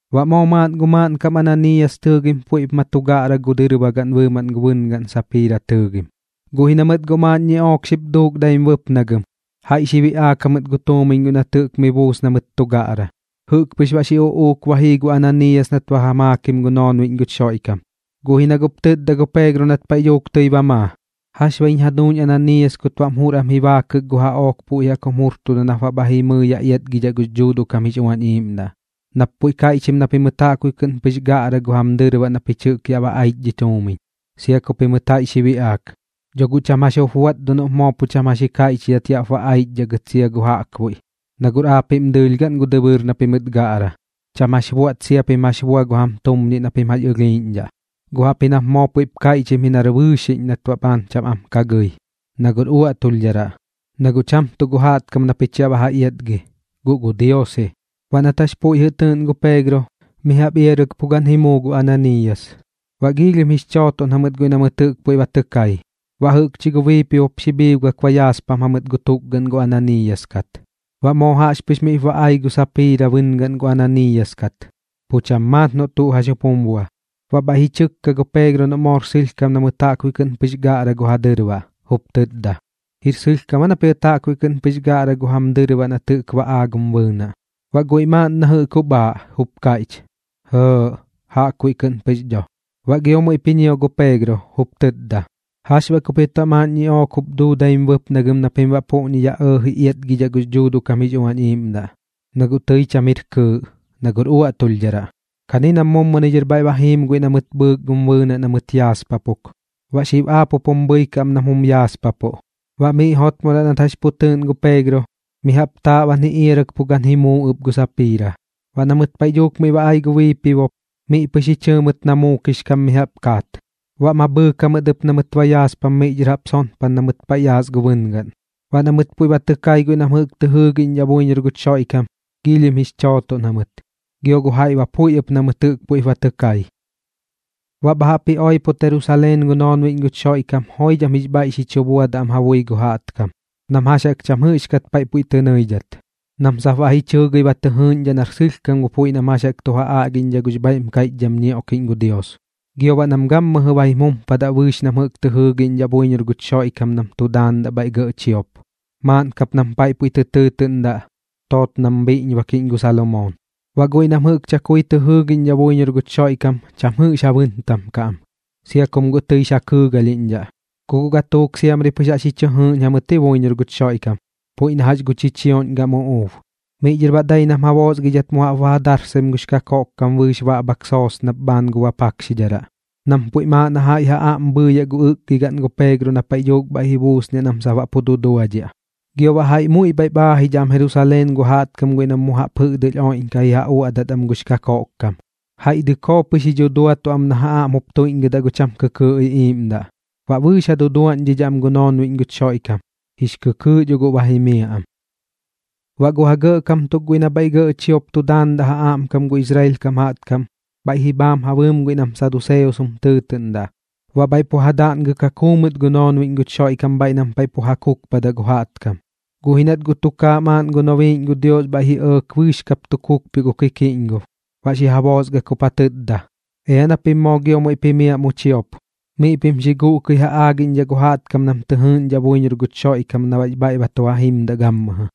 Baꞌ moo maaꞌn gu maaꞌnkam Ananiiyas tɨɨgim puiꞌp ma tu gaꞌra gu dɨrbagaꞌn bɨɨmaꞌn gu bɨngaꞌn Sapiira tɨɨgim. Guꞌ ji na mɨt guꞌ maaꞌn ñiꞌook xip duuk daim bɨpnagɨm, jaiꞌ xi biꞌaak jamɨt gu tuumiñ guiꞌ nat jɨꞌk mi buus na mɨt tu gaꞌra. Jɨꞌk pɨx baꞌ xi uꞌuuk ba jii gu Ananiiyas nat ba ja maakim gu noonbiꞌñ guch Xoiꞌkam. Guꞌ ji na guꞌp tɨtda gu Peegro nat paiꞌ dhuuk tɨi ba maa: ―¿Jax baꞌ jiñ jaduuñ Ananiiyas kut baꞌm jur am ji baakɨk gu jaꞌook puiꞌ jaꞌk jum jurtuda nap baꞌ bha jimɨi yaꞌ iatgidhaꞌ gux Dhuuduꞌ kam jix Uañ Iiꞌmdaꞌ, nap puiꞌ kaiꞌchim na pimɨt jaꞌkbuiꞌ kɨꞌn pɨx gaꞌra gu jam dɨrbaꞌ na pich jɨꞌk yaꞌ ba aich dhi tuumiñ, sia ku pimɨt jaiꞌ xi biꞌaak? Dho guꞌ cham jax jup buaꞌt dho noꞌp moo pu cham jax jup ji kaiꞌchidhat yaꞌp ba aichdhaꞌ gɨt sia gu jaꞌkbuiꞌ, na guꞌr aapiꞌm dɨɨlh gaꞌn gu dɨbɨɨr na pimɨt gaꞌra. Cham jax buaꞌt sia pim jax bua gu jam tumñiꞌ na pim jax ɨlhiiꞌñdhaꞌ. Guꞌ jaꞌpji nap moo puiꞌp kaiꞌchim ji nar bɨɨxiꞌñ nat baꞌ bhaan cham am ka gɨi, na guꞌr uaꞌtulhdharaꞌ. Na guꞌ cham tuꞌ gu jaꞌtkam na pich yaꞌ ba ja iatgi, guꞌ gu Dios ji. Baꞌ nat jax puiꞌ jɨꞌ tɨɨꞌn gu Peegro, mi jaꞌp iarɨk pu gan ji muu gu Ananiiyas. Baꞌ giilhim jix chootoꞌn jamɨt guiꞌ na mɨt jɨꞌk puiꞌ ba tɨ kai. Baꞌ jɨꞌkchi gu biipibop xi bhiibgak ba yaaspam jamɨt gu tukgaꞌn gu Ananiiyas kat. Baꞌ moo jaꞌxpɨx miꞌp ba ai gu Sapiira bɨngaꞌn gu Ananiiyas kat, pu cham maat noꞌ tuꞌ jax jup jum bua. Baꞌ bhaiꞌ ji chɨkka gu Peegro noꞌ moor sɨlhkam na mɨt jaꞌkbuiꞌ kɨꞌn pɨx gaꞌra gu ja dɨrbaꞌ, jup tɨtda: ―¿Jir sɨlhkam aa na pimɨt jaꞌkbuiꞌ kɨꞌn pɨx gaꞌra gu jam dɨrbaꞌ na jɨꞌk ba aaꞌ gum bɨɨnaꞌ? Baꞌ guiꞌ maaꞌn na jɨꞌk jup aaꞌ, jup kaiꞌch: ―Jɇɇꞌ, jaꞌkbuiꞌ kɨꞌn pɨx dho. Baꞌ gio muiꞌp ji ñio gu Peegro, jup tɨtda: ―¿Jax baꞌ ku pimɨt baꞌ maaꞌn ñiꞌook jup duu daim bɨpnagɨm na pim baꞌ puꞌñi yaꞌ ji ɇɇji iatgidhaꞌ gux Dhuuduꞌ kam jix Uañ Iiꞌmdaꞌ? Na guꞌ tɨi cham jir kɨɨꞌ, na guꞌr uaꞌtulhdharaꞌ. Kani nam muni dhɨr bhaiꞌ ba jiim guiꞌ na mɨt bhɨɨk gum bɨɨnaꞌ na mɨt yaaspapuk. Baꞌ xib aap jup jum bhɨikaꞌ am nam jum yaaspapuꞌ. Baꞌ miꞌ jotmodaꞌ nat jax pu tɨɨꞌn gu Peegro, mi jaꞌp taaꞌban ji iarɨk pu gan ji muu ɨp gu Sapiira. Baꞌ na mɨt paiꞌ dhuuk miꞌ ba ai gu biipibop, miꞌ pɨx ji chɨɨ mɨt na muukix kam mi jaꞌp kaat. Baꞌ ma bhɨɨk jamɨt ɨp na mɨt yaaspam miꞌ dhɨr jaꞌp sonpan na mɨt paiꞌ yaas gu bɨngaꞌn. Baꞌ na mɨt puiꞌ ba tɨ kai guiꞌ nam jɨꞌk tɨ jɨɨgiꞌñdhaꞌ buiñor guch Xoiꞌkam, giilhim jix chootoꞌn jamɨt, gio gu jaiꞌ ba puiꞌ ɨp na mɨt jɨꞌk puiꞌp ba tɨ kai. Baꞌ bha jaꞌp ji oipot Jerusaleen gu noonbiꞌñ guch Xoiꞌkam joidham jix bhaiꞌ xi chu buadaꞌ am ja bui gu jaꞌtkam nam jax jaꞌk cham jɨꞌxkat paiꞌ puiꞌ tɨ nɨidhat, nam sap baꞌ ji chɨɨgɨi ba tɨ jɨɨꞌñdhaꞌ nar sɨlhkam gu puiꞌ nam jax jaꞌk tu ja aꞌgiꞌñdhaꞌ gux bhaiꞌm kaiꞌchdham ñioꞌkiꞌñ gu Dios. Gio baꞌ nam gammɨjɨ ba jim jumpadaꞌ bɨɨx nam jɨꞌk tɨ jɨɨgiꞌñdhaꞌ buiñor guch Xoiꞌkam nam tu daandaꞌ bhaiꞌ gɇꞌ chiop, maaꞌn kap nam paiꞌ puiꞌ tɨ tɨɨtɨꞌndaꞌ: Tootnam Bhiꞌñbakiꞌñ gu Salomoon. Baꞌ guiꞌ nam jɨꞌk chakui tɨ jɨɨgiꞌñdhaꞌ buiñor guch Xoiꞌkam cham jix ja bɨntam kaꞌ am, sia kum guꞌ tɨix ja kɨɨgalhiꞌñdhaꞌ. Ku guꞌ gatuuk siamri pɨx jaꞌx ji chɨ jɨɨꞌñ jamɨt ji buiñor guch Xoiꞌkam, puiꞌ na jax gu chichioꞌñ gam uꞌuub. Miꞌ dhɨr baꞌ dai nam ja boosgaidhat mu jaꞌp ba ja darsaim gux kakoꞌkkam bɨɨx baꞌbhak soosnap bhaan gu bapakxidharaꞌ, nam puiꞌm aaꞌ na jaiꞌ ja aꞌm bhɨɨyaꞌ gu ɨkgigaꞌn gu Peegro na paiꞌ dhuuk bha buusniaꞌ nam sap baꞌ pu duduadhiaꞌ. Gio baꞌ jaiꞌ muiꞌ bhaiꞌp aajidhaꞌ am Jerusaleen gu jaꞌtkam guiꞌ nam mu jaꞌp jɨꞌdɨlh oiꞌdhaꞌkaꞌ ji ja uaꞌdat am gux kakoꞌkkam, jaiꞌ dɨkoo pɨx ji dhuduatuꞌ am na ja aꞌm jup tuiꞌñgɨdat gu cham kɨkɨɨꞌ iꞌiiꞌmdaꞌ. Baꞌ bɨɨx ja duduaꞌñdhidhaꞌ am gu noonbiꞌñ guch Xoiꞌkam, jix kɨkɨɨꞌ dho guꞌ ba jimiaꞌ am. Baꞌ gu ja gɇꞌkam tuk guiꞌ nam bhaiꞌ gɇꞌ chiop tu daandaꞌ ja aꞌmkam gu Israel kam jaꞌtkam, bhaiꞌ ji bhaam ja bɨɨm guiꞌ nam saduseos jum tɨɨtɨꞌndaꞌ. Baꞌ bhaiꞌ pu ja daꞌngɨk ja kuu mɨt gu noonbiꞌñ guch Xoiꞌkam bhaiꞌ nam paiꞌ pu ja kukpadaꞌ gu jaꞌtkam. Guꞌ ji nat guꞌ tukaaꞌ maaꞌn gu nobiiꞌñ gu Dios bhaiꞌ ji ɇɇk bɨɨx kap tu kukpioꞌ gu kikiꞌñgob, baꞌ xi ja boosgak jup ja tɨtda: ―Ea na pim moo giop muiꞌp jimiaꞌ mu chiop, miꞌ pim xi guꞌkɨi ja aagiꞌñdhaꞌ gu jaꞌtkam nam tɨ jɨɨꞌñdhaꞌ buiñor guch Xoiꞌkam na baꞌx bhaiꞌ ba tu ja jimdaꞌ gammɨjɨ.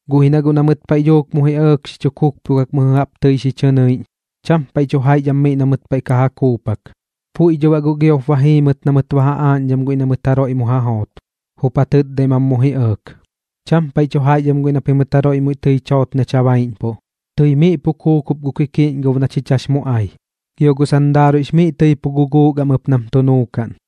Guꞌ ji na guꞌ na mɨt paiꞌ dhuuk mu ji ɇɇk xi kukpioꞌkak mɨjɨ jaꞌp tɨi xi chɨ nɨnɨiꞌñ, chaam paiꞌ tu jaiꞌch am miꞌ na mɨt paiꞌ ka ja kuupak. Puiꞌ dho baꞌ guꞌ giop ba jii mɨt na mɨt ba ja aaꞌñdham guiꞌ na mɨt jaroiꞌ mu ja joot, jup ja tɨtdaim am mu ji ɇɇk: ―Cham paiꞌ tu jaiꞌch am guiꞌ na pimɨt jaroiꞌ tɨi much joot nach ja baiꞌñpuꞌ. Tɨi miꞌ pu kuukup gu kikiꞌñgob na chich jax mu ai, gio gu sandaaruiꞌx miꞌ tɨi pu guguuk am ɨp nam tu nuukaꞌn.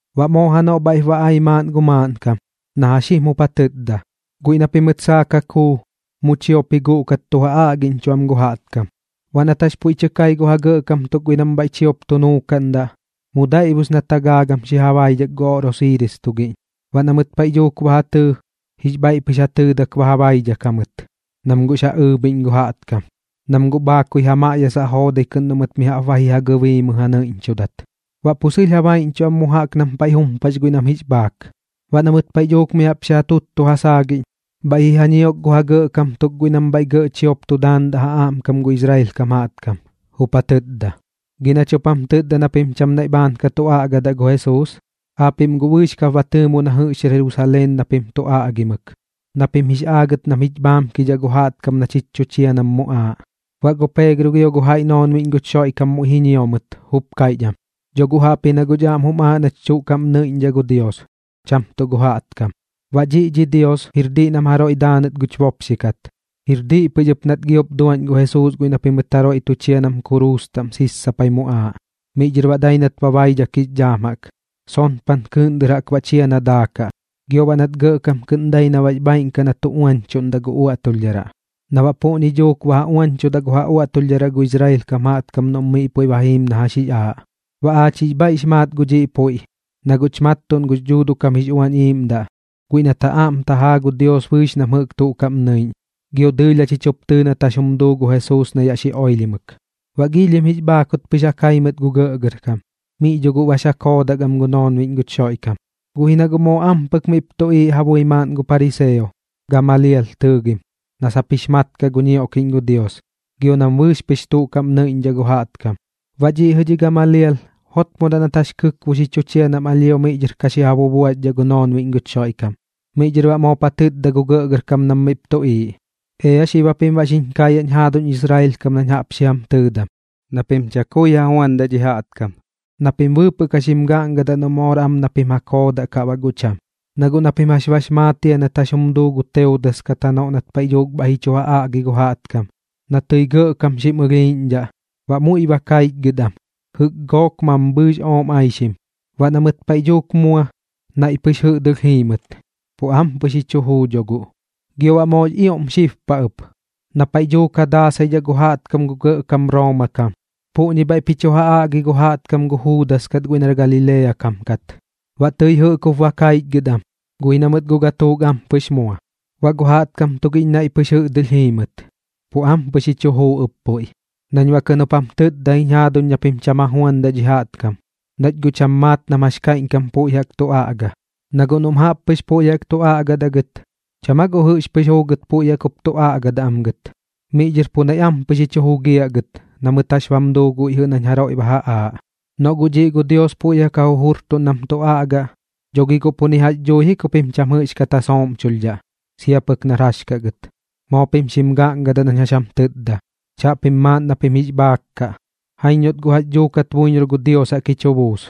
Baꞌ moo janoꞌ bhaiꞌp ba ai maaꞌn gu maaꞌnkam, na jax jim jup ja tɨtda: ―Guiꞌ na pimɨt saak ja kuu, mu chiop ji guꞌkat tu ja aꞌgiꞌñchuꞌ am gu jaꞌtkam. Baꞌ nat jax puiꞌ tɨ kai gu ja gɇꞌkam tuk guiꞌ nam bhaiꞌ chiop tu nuukaꞌndaꞌ, mu daiꞌbus nat ja gaagam xi ja baidhak gu oꞌrosiiris tugiꞌñ. Baꞌ na mɨt paiꞌ dhuuk ba ja tɨɨ, jix bhaiꞌ pɨx ja tɨɨdak ba ja baidhak jamɨt, nam guꞌx ja ɨɨbhiꞌñ gu jaꞌtkam, nam guꞌ bhaakui miꞌ ja maꞌyasaꞌ joodai kɨꞌn noꞌ mɨt mi jaꞌp ba ji ja gɨbiimɨ ja nɨiꞌñchudat. Baꞌ pu sɨlh ja baiꞌñchuꞌ am mu jaꞌk nam paiꞌ jumpax guiꞌ nam jix bhaak. Baꞌ na mɨt paiꞌ dhuuk mi jaꞌp xi ja tuttu ja saagiꞌñ, bhaiꞌ ji ja ñiok gu ja gɇꞌkam tuk guiꞌ nam bhaiꞌ gɇꞌ chiop tu daandaꞌ ja aꞌmkam gu Israel kam jaꞌtkam, jup ja tɨtda: ―Gi nach jup jam tɨtda na pim cham naiꞌ bhaan ka tu aꞌgadaꞌ gu Jesuus. Aapiꞌm guꞌ bɨɨx kap ba tɨɨmo na jɨꞌx jir Jerusaleen na pim tu aꞌgimɨk, na pim jix aagɨt nam jich bhaamkidhaꞌ gu jaꞌtkam na chich tu chia nam muꞌaaꞌ. Baꞌ gu Peegro gio gu jaiꞌ noonbiꞌñ guch Xoiꞌkam muiꞌ ji ñio mɨt, jup kaiꞌch am: ―Dho guꞌ jaꞌpji na guꞌch aꞌm jum aaꞌ nach tuꞌ kaꞌm nɨiꞌñdhaꞌ gu Dios, cham tuꞌ gu jaꞌtkam. Baꞌ dhiꞌ dhi Dios jir diꞌ nam jaroiꞌ daanɨt guch bopxi kat, jir diꞌ pɨx ɨp nat giop duaꞌñ gu Jesuus guiꞌ na pimɨt jaroiꞌ tu chia nam kuruus taꞌm sissapai muꞌaaꞌ. Miꞌ dhɨr baꞌ dai nat ba baidhak jix dhaam jaꞌk, sonpan kɨɨꞌn dɨr jaꞌk baꞌ chia na daakaꞌ. Gio baꞌ nat gɇꞌkam kɨꞌn dai na baꞌx bhaaiꞌn kaꞌ na tu uañchuꞌndaꞌ gu uaꞌtulhdharaꞌ, na baꞌ puꞌñi duuk ba ja uañchudaꞌ gu ja uaꞌtulhdharaꞌ gu Israel kam jaꞌtkam noꞌm miꞌ puiꞌ ba jiim na jax jix aaꞌ. Baꞌ aach jix bhaiꞌx maat gu dhiꞌ puiꞌ, na guꞌch mattuꞌn gux Dhuuduꞌ kam jix Uañ Iiꞌmdaꞌ guiꞌ nat ja aꞌm tajaa gu Dios bɨɨx nam jɨꞌk tuꞌ kaꞌm nɨiꞌñ, gio dɨɨlh jachich jup tɨɨ nat jax jum duu gu Jesuus na yaꞌ xi oilhimɨk. Baꞌ giilhim jix bhaakut pɨx ja kai mɨt gu gɇꞌgɇrkam, miꞌ dho guꞌ bax ja koodak am gu noonbiꞌñ guch Xoiꞌkam. Guꞌ ji na guꞌ moo ampɨk miꞌp tuꞌiiꞌ ja bui maaꞌn gu pariseo, Gamalial tɨɨgim, na sap jix mat kaꞌ gu ñioꞌkiꞌñ gu Dios, gio nam bɨɨx pɨx tuꞌ kaꞌm nɨiꞌñdhaꞌ gu jaꞌtkam. Baꞌ dhiꞌ jɨꞌ dhi Gamalial jotmodaꞌ nat jax kɨkbo xi chu chia nam alhio miꞌ dhɨr ka xi ja bubuaxdhaꞌ gu noonbiꞌñ guch Xoiꞌkam. Miꞌ dhɨr baꞌ moop ja tɨtda gu gɇꞌgɇrkam nam miꞌp tuꞌiiꞌ: ―Ea xib japim baꞌ xiñ kaayaꞌñ jaaduñ Israel kam nañ jaꞌp xi jam tɨɨdam, na pim chakui ja juandaꞌ dhi jaꞌtkam, na pim bɨɨpɨꞌ ka xim gaꞌngadaꞌ noꞌ moor am na pim ja koodaꞌ kaꞌ baꞌ guꞌ cham. Na guꞌ na pim jax bax maat jia nat jax jum duu gu Teudas kat janoꞌ nat paiꞌ dhuuk bhaiꞌ ji chu ja aꞌgi gu jaꞌtkam, na tɨi gɇꞌkam xim ɨlhiiꞌñdhaꞌ, baꞌ muiꞌ ba kaichgɨt am, jɨꞌk gook mambhɨɨx ooꞌm aixim. Baꞌ na mɨt paiꞌ dhuuk mua, naiꞌ pɨx jɨꞌdɨlh jii mɨt, pu ampɨx ji chu juu dho guꞌ. Gio baꞌ moox ioꞌm xib paꞌ ɨp, na paiꞌ dhuuk ja daasaidhaꞌ gu jaꞌtkam gu gɇꞌkam Rooma kam, puꞌñi bhaiꞌp ji chu ja aꞌgi gu jaꞌtkam gu Juudas kat guiꞌ nar Galilea kam kat. Baꞌ tɨi jɨꞌk jup ba kaichgɨt am, guꞌ ji na mɨt guꞌ gatuuk ampɨx mua, baꞌ gu jaꞌtkam tugiꞌñ naiꞌ pɨx jɨꞌdɨlh ji jii mɨt, pu ampɨx ji chu juu ɨp puiꞌ. Nañ baꞌ kɨꞌn jup jam tɨtda jiñ jaaduñ na pim cham ja juandaꞌ dhi jaꞌtkam, nach guꞌ cham maat nam jax kaiꞌñkam puiꞌ jaꞌk tu aꞌga. Na guꞌ noꞌm jaꞌp pɨx puiꞌ jaꞌk tu aꞌgadaꞌ gɨt, ¿cham aa guꞌ jɨꞌx pɨx juugɨt puiꞌ jaꞌk jup tu aꞌgadaꞌ am gɨt, miꞌ dhɨr pu naiꞌ ampɨx ji chu jugiaꞌ gɨt na mɨt jax bam duu gu jaiꞌ guiꞌ nañ jaroiꞌ ba ja aaꞌ? Noꞌ guꞌ dhiꞌ gu Dios puiꞌ jaꞌk ja jujurtuꞌn nam tu aꞌgaꞌ, dho gi guꞌ pu ni jax dhui ji ku pim cham jɨꞌxkat ja sooꞌmchulhdhaꞌ, sia pɨk nar jax kaꞌ gɨt. Moo pim xim gaꞌngadaꞌ nañ jax jam tɨtda. Chaꞌpim maaꞌn na pim jix bhaak kaꞌ, jaiñ noꞌt guꞌ jax dhuukat buiñor gu Dios jaꞌk ji chu buus.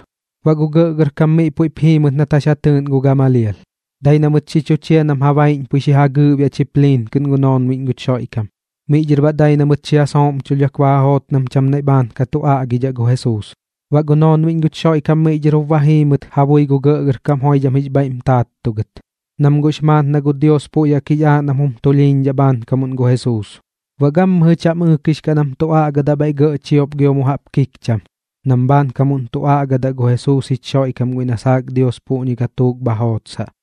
Baꞌ gu gɇꞌgɇrkam miꞌ puiꞌp jii mɨt nat jax ja tɨɨꞌn gu Gamalial. Dai na mɨt xi chu chia pɨx nam ja baiꞌñpui xi ja gɨɨꞌbiaꞌ chipliin kɨꞌn gu noonbiꞌñ guch Xoiꞌkam. Miꞌ dhɨr baꞌ dai na mɨt xi ja sooꞌmchulhdhak ba ja joot nam cham naiꞌ bhaan ka tu aꞌgadaꞌ gu Jesuus. Baꞌ gu noonbiꞌñ guch Xoiꞌkam miꞌ dhɨr jup ba jii mɨt ja bui gu gɇꞌgɇrkam joidham jix bhaiꞌm taattugɨt, nam guꞌx maat na gu Dios puiꞌ jaꞌk jix aaꞌ nam jum tulhiiñdhaꞌ bhaankamuꞌn gu Jesuus. Baꞌ gammɨjɨ cham ɨɨkix kaꞌ nam tu aꞌgadaꞌ bhaiꞌ gɇꞌ chiop gio mu jaꞌp kikcham, nam bhaankamuꞌn tu aꞌgadaꞌ gu Jesuus jich Xoiꞌkam guiꞌ na saak Dios puꞌñi gatuuk bha jootsaꞌ.